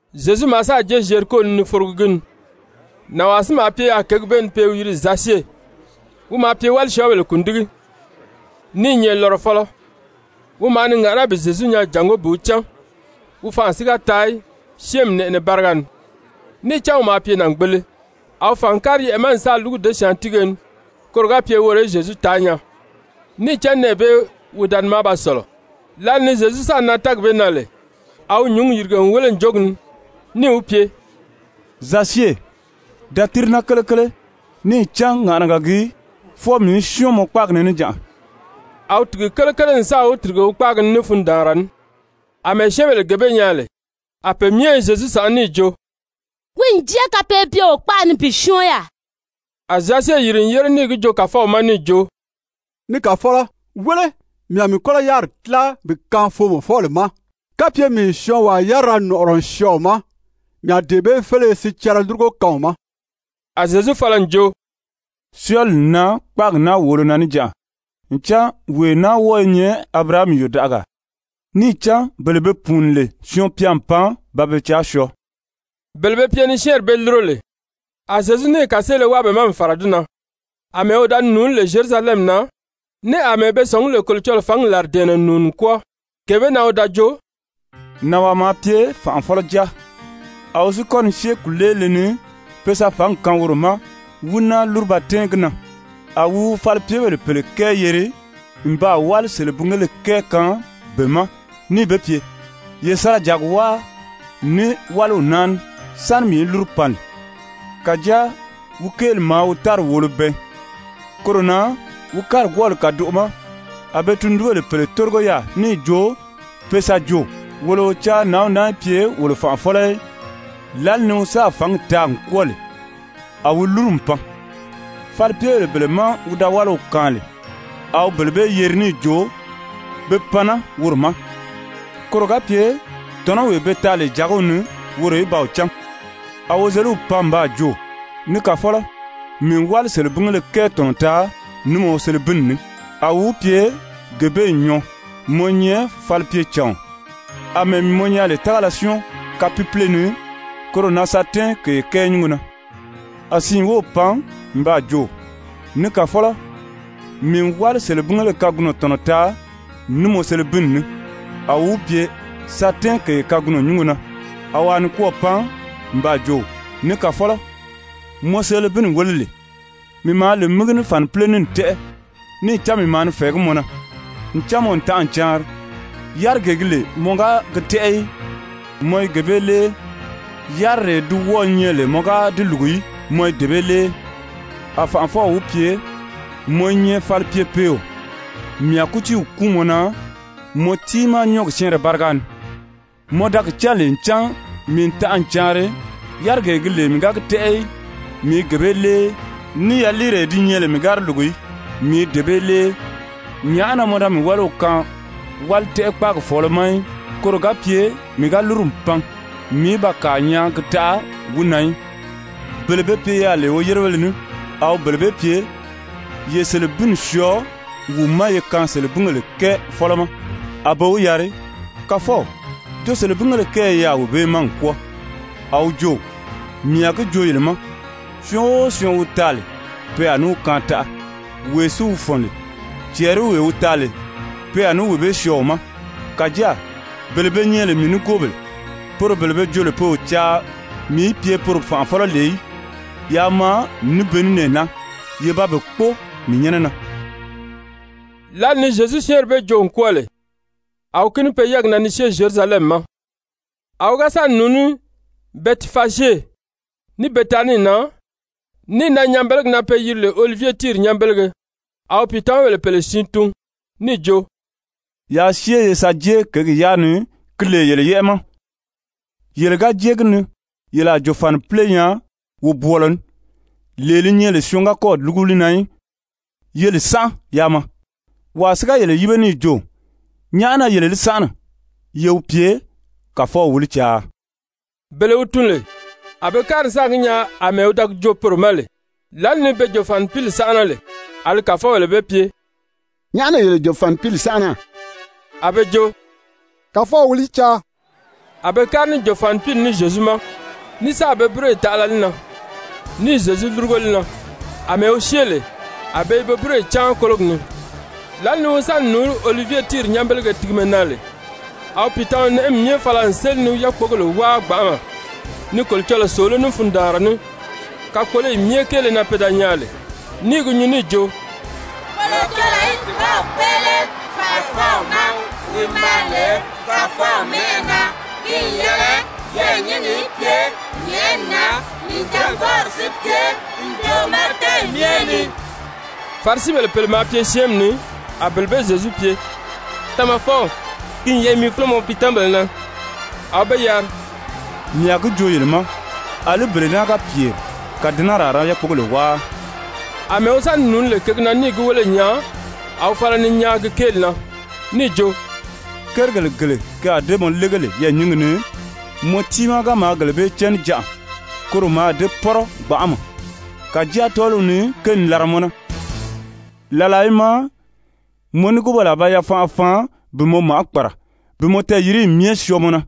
Zyezu maa sáà jée Zyeriko ni ni forogi gi ni. Nànwaa si maa pye yaà kěgi bee ni pe i wi yiri Zasye, wi maa pye wálisyɔɔbèle kùndigi, ní i nyɛ lɔrɔfɔlɔ. Wi maa ni ŋàʔaná bi Zyezu nyaa jàngó bi wi cán, wi fanʔa si ga taa í syɛ́ɛnmi nɛʔɛnɛ báriga ni, níì cán wi maa pye nàngbele. A wi fàn n kári yɛʔɛ̀ ma n sáà lúgu děsyaantiige ni koro ga pye woro í Zyezu taa nyaa, níì cán nɛɛ bee wi da ni maa ba sɔ̀lɔ. Lǎli ni Zyezu sáà nan tɛ́ɛgi bee na lè, a wi nyǔngi yìrige n wéle ǹjogi ni, níì wi pye: «Zasye, da tíri naa kelekele. Níì cán ŋàʔanaga gii fwɔɔ mii í syɔ́ɔn mɔ kpáagi ni níjanʔa.» A wi tìgi kelekele n sáà wi tìrige wi kpáagi ni ní fundaanra ní. Amɛɛ syɛ́ɛnbèle gee bee nyaa lè, a pe myɛ i Zyezu sànʔá níì jo: «Wi n jée kapeebyeo kpaʔa ni bi syɔ́ɔn yaà.» A Zasye yìri n yére níì gi joo Kàfɔw ma níì jo: «Ni Kàfɔlɔ, wéle, mii a mii kɔ́lɔ yáriri tíla bi kaan foomɔfɔbèle ma. Kapye mii n syɔɔnwaa yárira nɔ̀ʔɔrɔ n syɔɔ wi ma, mii a dee bee féleye sicɛrɛ lúrugo kaan wi ma.» A Zyezu fala n jo: «Syɔɔli n nan kpáagi naa wòolo na níjanʔa, ncan wee naa wɔ́ɔ i nyɛ Abirahami yòdaʔagaa. Níì cán bele be pùuni lè Syɔɔn-pya n pan ba be caa syɔɔ.» Bele be pye ni syɛ́ɛnri bee lúro lè, a Zyezu níì kàseele wáa be ma n fàra di na, àmɛɛ wi da ni nùuní lè Zyerusalɛmi na, ní àmɛɛ be sɔ̀ngí lè Kolocɔlɔɔ fǎngi làridɛ̀ɛnnɛ n nùuni n kwɔ́ɔ, gee bee na a wi jo: «Nànwaa maa pye fànʔafɔlɔ jáa, a wi si kɔ́ ni syée kùleelile ni pe sa fǎngi kaan woro ma, wí náa lúru ba tɛ́ɛn gi na. A wi wi falipyebèle pèle kɛɛ yeri n baa wáli selebingéle kɛɛ kaan be ma níì be pye: ‹Ye sa ra jàgi wáa ní wáliw naa ní sáni mii í lúru pan lè.› Kàjáa wi kéeli maa wi tári wòolo bɛɛn. Koro na wi kárigwɔɔli kàdoʔo ma a be tundunbèle pèle tórigo yaà níì jo pe sa jo: ‹Wolo o caa nǎnw naa í pye wolo fànʔafɔlɔ í.› Lǎli ni wi sáà fǎngi taa n kwɔ́ɔ lè, a wi lúru n pan. Falipyebèle bele má wi da wáliw kaan lè, a wi bele bee yeri níì jo be pan naa woro ma, koro ga pye tɔ̀nɔwee be taa lè jàgiw ni woro í ba wi cán. A wozeliw pan n baa jo: ‹Ni kàfɔlɔ, mii n wáli selebingéle kɛɛ tɔ̀nɔ taa ní mɔ selebinni ní.› A wi wi pye: ‹Gee bee n nyɔɔ, mɔ i nyɛ falipyecàɔn. Amɛɛ mii mɔ nyaa lè tágala syɔ́ɔn kapiipiile ni, koro na sa tɛ́ɛn kèye kɛɛ nyúngo na.› A siin wów pan n baa jo: ‹Ni kàfɔlɔ, mii n wáli selebingéle kagunɔ tɔ̀nɔ taa ní mɔ selebinni ní.› A wi wi pye: ‹Sa tɛ́ɛn kèye kagunɔ nyúngo na.› A wàa nikwɔɔ pan n baa jo: ‹Ni kàfɔlɔ, mɔ selebinni wéle lee, mii maa li mígi ní fànipile ní n tɛ́ʔɛ. Níì cán mii maa ni fɛ̀ɛgí mɔ na, ncan mɔ n tanʔa n caanri. Yárigee gi nyɛ lè mɔ ga gi tɛ́ʔɛ í, mɔ i gee bee lée, yaliiree di wɔ́ɔ̄ nyɛ lè mɔ ga di lùgu í, mɔ i dee bee lée.› A fànʔafɔw wi pye: ‹Mɔ i nyɛ falipyepeeo, mii a kútiiw kúun mɔ na mɔ tiimaa nyɔ́ɔgi syɛ́ɛnrɛ báriga ni. Mɔ da gi cán lè ncan mii n tanʔa n caanri, yárigee gi nyɛ lè mii ga gi tɛ́ʔɛ í, mii i gee bee lée, ní yaliiree di nyɛ lè mii ga di lùgu í, mii i dee bee lée, nyàʔá na mɔ da mii wáliw kaan wálitɛʔɛ-kpaagi fɔ̀ɔlɔ ma í, koro ga pye mii ga lúru n pan, mii í ba kàa nyaa gi taʔa wi na í?› Bele be pye yaà lè woyérebéle ní, a wi bele bee pye: ‹Ye selebinni syɔɔ wi ma ye kaan selebingèle kɛɛ fɔ́lɔ ma.› A be wi yari: ‹Kàfɔw, jo selebingéle kɛɛ i yaà wee bee ma n kwɔ́ɔ.› A wi jo: ‹Mii a gi joo yele ma, syɔɔn o syɔɔn wi taa lè, pe a ní wi kaan taʔa, wee si wi fɔ̀n lè, cɛɛriwee wi taa lè, pe a ní wee bee syɔɔ wi ma. Kàjáa bele be nyɛ lè mii nigoobèle, poro bele be jo lè pe o caa mii í pye poro fànʔafɔlɔ lè í, yaa maa ní be ní nɛɛ naa, ye ba be kpóo mii nyɛ́nɛ na.›» Lǎli ni Zyezu syɛ́ɛnri bee joo n kwɔ́ɔ lè, a wi kíni pe yɛ́ɛgi na ni syée Zyerusalɛmi ma. A wi ga sa ni nùuní Bɛtifazye ní Betanii na, níì nan nyanbelegi na pe yiri lè Olivye tíiri nyanbelege, a wi pìitamabèle pèle siin tun níì jo: «Yaa syée ye sa jée kěgi yaa ni, ki lè yele yɛ́ʔɛ ma. Yele ga jée gi ni, yele a jòfanipile nyaa wobwɔɔlɔ ní, lee li nyɛ lè syɔɔn ga kɔ́ɔ̀ lúgu li na í. Ye li sánʔa yaa maa. Wàa si ga yele yíbe níì jo: ‹Nyàʔá na yele li sánʔana?› Ye wi pye: ‹Kàfɔw wi li caa.›» Bele wi tun lè, a be kári n sáà gi nyaa àmɛɛ wi da gi joo poro ma lè. Lǎli ni be jòfanipili sánʔana lè, a li kàfɔbèle be pye: «Nyàʔá na yele jòfanipili sánʔana?» A be jo: «Kàfɔw wi li caa.» A be kári ní jòfanipili ní Zyezu ma, ní sáà be búroyi taʔala li na, níì Zyezu lúrugo li na. Amɛɛ wi syée lè, a be i be búroyi cáan kólogi ni. Lǎli ni wi sa ni nùuní Olivye tíiri nyanbelege tigimɛ na lè, a wi pìitama-nɛʔɛmi myɛ fala n séli ni yákpogèle wáa gbanʔama ni Kolocɔlɔɔ sòoló ní fundaanra ní kakpoloyi myɛ kéele na pe da nyaa lè, ní i gi nyuu níì jo: «Kolocɔlɔɔ í dùbaw kpéʔele fànʔafɔw ma, wi maa lè Kàfɔw mɛ́ʔɛ na! Ki n yɛlɛ yɛɛ̀nyingi í pye nyɛ̀ʔɛni na, nìjangbɔɔri si pye ǹjoʔo ma tɛ́ɛyi myɛ ni.» Farisibèle pèle maa pye syɛ́ɛnmi ni, a bele bee Zyezu pye: «Tamafɔw, ki n yɛlɛ mi fúlo mɔ piitamabèle na.» A wi be yari: «Mii a gi joo yele ma, àlí bele naa ga pyèri, kàdɛnɛri a ra yákpogèle wáa!» Amɛɛ wi sa ni nùuní lè kěgi na níì gi wéle n nyaa, a wi fala ni nyaan gi kéeli na níì jo: «Kérigèle gele ke a dée mɔ lége lè yɛɛ̀nyingi ni, mɔ tiimaa ga maa gele bee cán níjanʔa, koro mǎà dée pɔ́rɔ gbanʔama! Kàjáa tɔ́ɔliw ni ke n làra mɔ na. Làlaa i maa mɔ nigoobèle a ba yafanʔa faan bi mɔ màʔá kpàra bi mɔ tɛɛyiriyi myɛ syɔɔ mɔ na,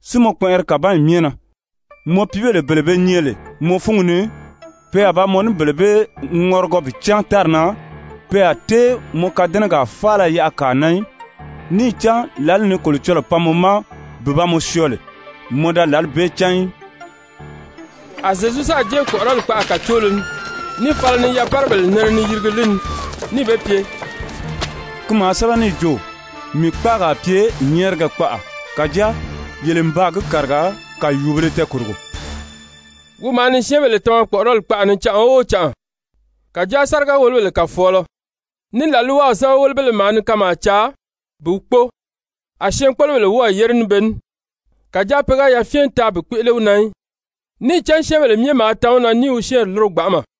si mɔ kpɛnʔɛri kàbanyi myɛ na. Mɔ piibèle bele be nyɛ lè mɔ fúngi ni, pe a ba mɔ ní bele bee ŋɔrigɔ bi cáan tári na. Pe a tée mɔ kadɛnɛgaa faala yaʔa kàa na í, níì cán lǎli ni Kolocɔlɔɔ pan mɔ ma bi ba mɔ syɔɔ lè, mɔ da lǎli bee cán í.» A Zyezu sáà jée kpɔ̀ʔɔrɔli kpaʔa kàcoolo ni, níì fala ni yapárabèle nɛnɛ ni yirigi li ni níì be pye: «Ki maa sɛ́bɛ níì jo: ‹Mii kpáagi a pye nyɛ́ɛrigɛ kpaʔa.› Kàjáa yele n baa gi kàriga kàyuubēle tɛɛkòrogo.» Wi maa ni syɛ́ɛnbèle tama kpɔ̀ʔɔrɔli kpaʔa ni canʔa o canʔa. Kàjáa sáriga-wòlobèle kàfɔɔlɔ, ní làlwaw sɛ́bɛwelebéle maa ni kanmaa caa bi wi kpóo, a syɛɛnkpolobèle wɔ́ɔ̀ yére ní be ní. Kàjáa pe ga yafyɛn taa bi kpéʔele wi na í, níì cán syɛ́ɛnbèle myɛ maa tan wi na ní i wi syɛ́ɛnri lúro gbanʔama.